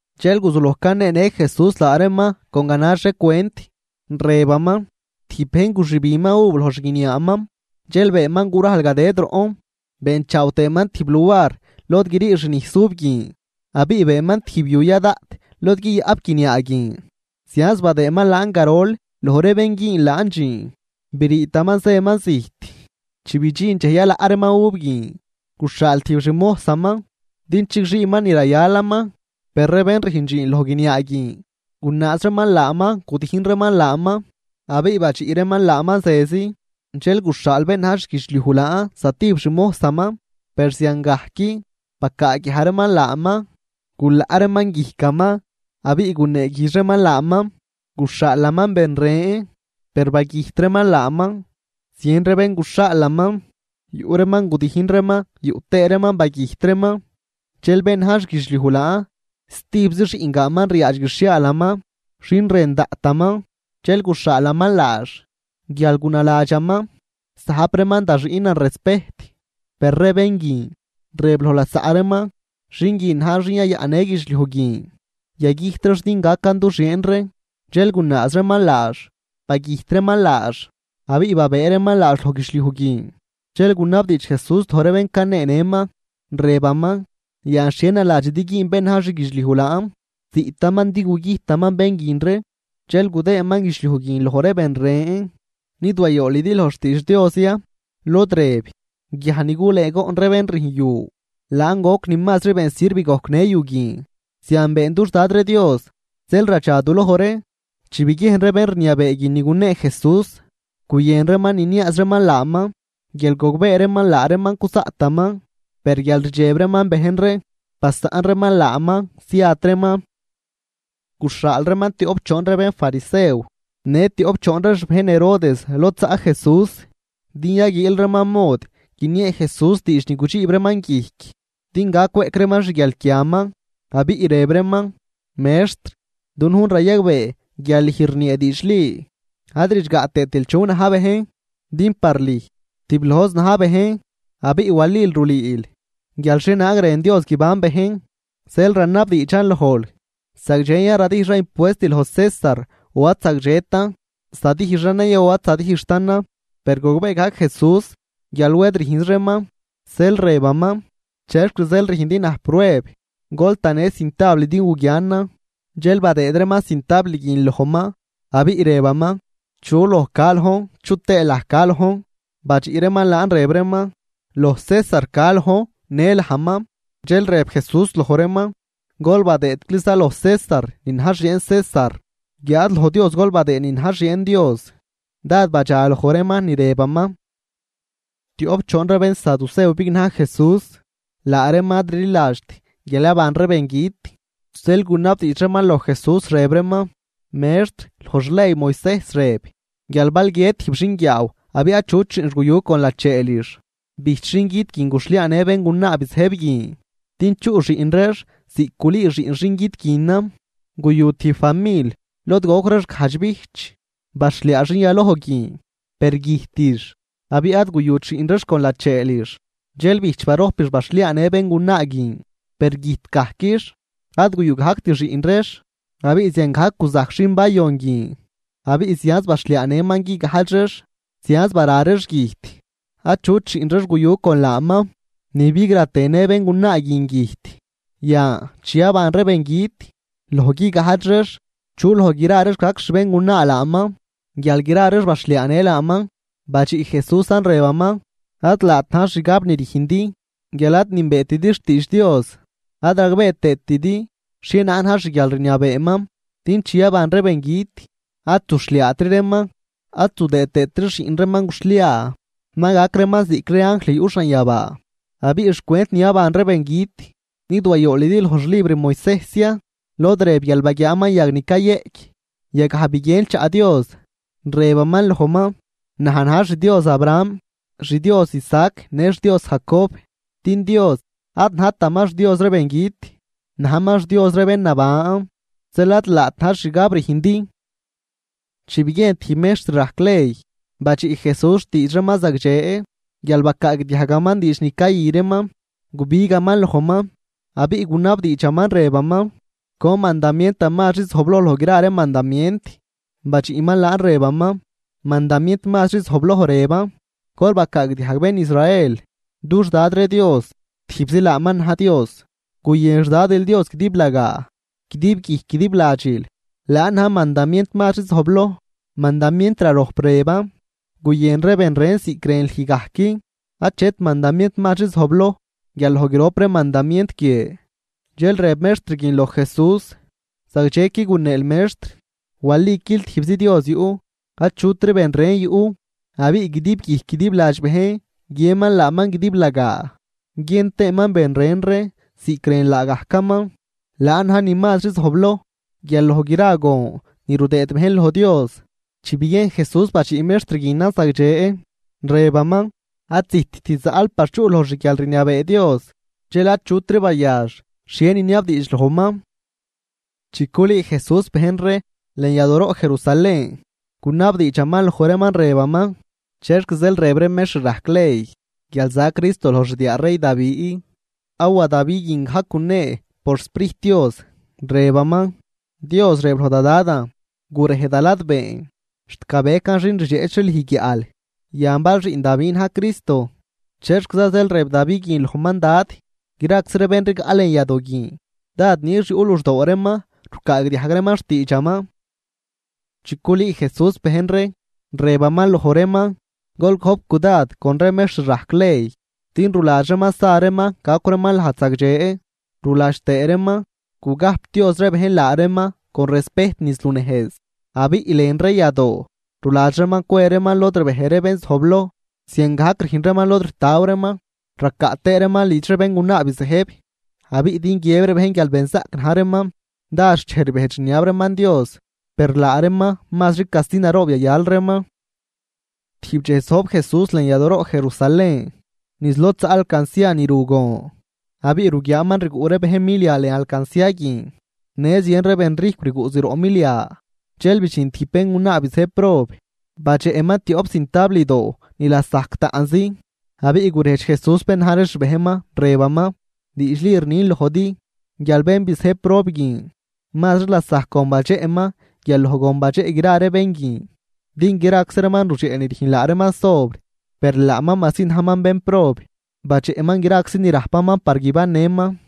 Dxel guzuloj caneenë Jesús laa reeman con ganax ree cwent, rëbaman: ―Tijb bejn guxübinman uv loj xguiniaaman, dxel beenman gurajl gadëd roꞌn, beenchaaw tëëman tijb luar lod grii xnijs uv guin, abiꞌ beenman tijb yu ya daꞌt lod guiyaꞌp guiniaa guin. ’Zianz badëëman laan garol loj ree bén güün laan dxiin, briitaman zëman zijt. Chi bidxin dxej yalaꞌ reeman uv guin, guxhaal tijb xmojsaman din chigxiiman ni rayalaman. Per ree bén rüjn dxiin loj guiniaa guin gunaaz reeman laaman, gudijn reeman laaman abiꞌ badxiꞌ reeman laaman zezi. Dxel guxhaal bén na̱j xguidxliuj laan zatijb xmojsaman, per ziangajc, bacaaguiaj reeman laaman, gulaꞌ reeman guijcaman abiꞌ guneeguijdx reeman laaman. Guxhaalaman ben ren, per bagüjt reeman laaman. Zien ree ben guxhaalaman, yuꞌ reeman gudijn reeman yuꞌ tëë reeman bagüjt reeman. ’Dxel bén na̱j xguidxliuj laan stijbzi xiꞌngaanman ryaadx guixhiaalaman, xin rën daꞌtaman. Dxel guxhaalaman laax guial gunaladxaman: “Zajp reeman da xiꞌnan respejt.” Per ree bén guin, rëb loj lasaꞌ reeman: “Xin guin na̱j xin yayaꞌnnë guidxliuj guin, yagüjt reex din gacan du xieen ree.” Dxel gunaaz reeman laax, bagüjt reeman laax abiꞌ babëë reeman laax loj guidxliuj guin. Dxel gunabdiidx Jesús loj ree bén caneenëman, rëbaman: ―Yan, ¿xhie naladxidi güün bén na̱j xguidxliuj laan? Ziꞌtaman din gugüjtaman bén guin ree, dxel gudëëman guidxliuj guin loj ree ben ren. ’¿Nid wayoolidi loj xtiidx Dios ya?, lod rëb: Guiaj ni gulëëgoꞌn ree bén rüjn yu, laan goc ni mazri been sirv gojcnë yu guin. Zian been dux Dad ree Dios, zeel radxaduloj ree. Chi biguiejn ree bén rniabee guin ni gunee Jesús, guyën reeman niniaaz reeman laaman guial gogbee reeman laa reeman cuzaꞌtaman, per guial rdxeb reeman bejn ree, basaꞌn reeman laaman, ziat reeman. Guxhaal reeman tioꞌp choon ree bénfarisew në tioꞌp choon ree xbejn Herodes lod zaꞌ Jesús, din yaguiil reeman mod guiniee Jesús diidx ni gudxiib reeman guijc din gac cweꞌc reeman xguialquiaman. Abiꞌ rëb reeman: ―Mextr, dunujn rayagbee guial lüj rniee diidxli ad ridxgaꞌ tëëtil chu na̱j bejn. Din par lüj tiblojzi na̱j bejn, abiꞌ walil rulüül guial xhienaag rën Dios guiban bejn. Zeel ranabdiidxan lojl: ¿Zagdxen ya radijxan impuest loj César o ad zagdxetan? ¿Zadijxanan ya o ad zadijxtanan? Per gogbee gajc Jesús guial wed rüjnz reeman, zeel rëbaman: ―¿Chexc zeel rüjndi naj prueb? Gol tanë cintabl din guguianan. Dxel badëëd reeman cintabl guin lojman, abiꞌ rëbaman: ―¿Chu loj ca lojn, chu tëë laj ca lojn? Badxiꞌ reeman laan rëb reeman: ―Loj César ca lojn në lajman. Dxel rëb Jesús loj reeman: ―Gol badëëcliza loj César ni na̱j xieen César, guiáad loj Dios gol badëëd ni na̱j xieen Dios. Dád badxa loj reeman ni rëbaman. Tioꞌp choon ree bénsaducew bignaj Jesús, laa reeman ad rliladxt guial yaban ree bengüt. Zeel gunabdiidx reeman loj Jesús rëb reeman: ―Mextr, loj xley Moisejs rëb guial bal guiët tijb xinguiaaw abiꞌ achut xiꞌnx guyu con lacheelix, bijch xin güt guin guxhliaanë béngunaa bizëjb guin din chuꞌ xiꞌn reex ziꞌc gulüü xiꞌn xingüt guinan. Guyu tijb famil lod goc reex gajdx bijch. Baxhliaa xin yaloj guin, per güjtix abiꞌ ad guyut xiꞌn reex con lacheelix. Dxel bijch barojpix baxhliaanë béngunaa guin, per güjt gajquix, ad guyu gajct xiꞌn reex. Abiꞌ ziangajc guzajc xin bayon guin, abiꞌ zianz baxhliaanëman guigajdx reex, zianz bara reex güjt achut xiꞌn reex guyu con laaman. Ni bigra tëë në béngunaa guin güjt. Yan, chi yaban ree bengüt, loj guigajdx reex, ¿chu loj gra reex gac xbéngunaa laaman guial gra reex baxhliaanë laaman? Badxiꞌ Jesúsan rëbaman: ―Ad laat na̱j xgab rüjndi guial ad nünbeetidi xtiidx Dios ad ragbee tëëtidi xhienaag na̱j xguialrniabeeman. Din chi yaban ree bengüt, ad zuxhliaatri reeman, ad zudëë tëëtri xiꞌn reeman guxhliaa, ma gac reeman ziꞌc ree anjl yuꞌ xanyabaa. Abiꞌ xcwent ni yaban ree bengüt, ¿nid wayoolidi loj xlibr Moisejs ya, lod rëb guial baguiaaman yag ni cayëꞌc? Yagaj biguien chaꞌ Dios, rëbaman lojman: “Naj na̱j xDios Abraham, xDios Isaac në xDios Jacob.” Din Dios ad najtaman xDios ree bengüt, najman xDios ree bén naban. Zeel ad laat na̱j xgab rüjndi. Chi biguiejn tijb mextr rajc ley badxiꞌ Jesús xtiidx reeman zagdxe guial bacaagdiajgaman diidx ni cayü reeman, gubigaman lojman, abiꞌ gunabdiidxaman rëbaman: ―¿Con mandamientan mazri zojbloj loj gra ree mandamient? Badxiꞌman laan rëbaman: ―Mandamient mazri zojbloj rëban: “Gol bacaagdiajg, bén Israel, dux Dad ree Dios, tijbzi laaman na̱j Dios. Guyën xDadil Dios guidiblagaa guidib guijc guidib ladxil.” Laan na̱j mandamient mazri zojbloj. Mandamient rarojp, rëban: “Guyën ree ben ren ziꞌc rën lüj gajc.” Achet mandamient mazri zojbloj guial loj grop ree mandamient guie. Dxel rëb mextr guin loj Jesús: ―Zagdxequi guneel, Mextr. Waliquil tijbzi Dios yuꞌ, achutri ben ren yuꞌ. Abiꞌ guidib guijc guidib ladx bejn guiënman laaman guidiblagaa, guiën tëëman ben ren ree ziꞌc rën laagajcaman. Laan na̱j ni mazri zojbloj guial loj gra gon ni rudëëd bejn loj Dios. Chi biguien Jesús badxiꞌ mextr guinan zagdxe, rëbaman: ―Ad zijtt zaꞌl par chuꞌl loj xguialrniabee Dios. Dxel achutri bayax xhie niniabdiidx lojman. Chi culüü Jesús bejn ree lën yadooroꞌ Jerusalén, gunabdiidxaman loj reeman rëbaman: ―¿Chexc zeel rëb ree mextr rajc ley guial za Cristo loj xdiaa rey Davi? Awa Davi guin gajc gunee por xSprijt Dios, rëbaman: Dios rëb loj da Dadan: “Gurej da ladbeen, xt gabecan xin rdxeꞌch ree lüj guiaꞌl.” Yan bal xiꞌn Davi na̱j Cristo, ¿chexquiza zeel rëb Davi guin lojman Dad? Graczi ree bén rigaꞌ lën yadoo guin dád nix yuꞌ luxdoo reeman rucaagdiajg reeman xtiidxaman. Chi culüü Jesús bejn ree, rëbaman loj reeman: ―Gol gojp cudad con ree mextr rajc ley, din ruladx reeman sa reeman gacw reeman lajd zagdxe, ruladx tëë reeman gugajpdioz ree bejn laa reeman con respejt niz lunejz. Abiꞌ lën ree yadoo ruladx reeman cwe reeman lod rbej ree bén zojbloj, ziangajc rüjn reeman lod ritaw reeman. Racaꞌ tëë reeman lidx ree béngunaa bizëjb, abiꞌ din guiëb ree bejn guial benzaꞌc na̱j reeman, dád xchej rbejdx rniab reeman Dios. Per laa reeman mazri casti naroob yayal reeman. Tijb dxej zojb Jesús lën yadooroꞌ Jerusalén niz lod zaꞌ alcancia ni ru gon, abiꞌ ruguiaaman rguꞌ ree bejn milia lën alcancia guin, në zien ree benrijcw rguꞌ zroꞌ milia. Dxel bidxin tijb béngunaa bizëjb prob, badxeꞌman tioꞌp zintabldoo ni lasajc taꞌnzi. Abiꞌ gurejdx Jesús bén na̱j ree xbejnman, rëbaman: ―Diidxli rnin lojdi guial bén bizëjb prob guin mazri lasajc gon badxeꞌman guial loj gon badxeꞌ gra ree bén guin. Din graczi reeman rudxeꞌ ni rüjn laa reeman sobr, per laaman majsi najman bénprob, badxeꞌman graczi ni rajpaman par guibannëman.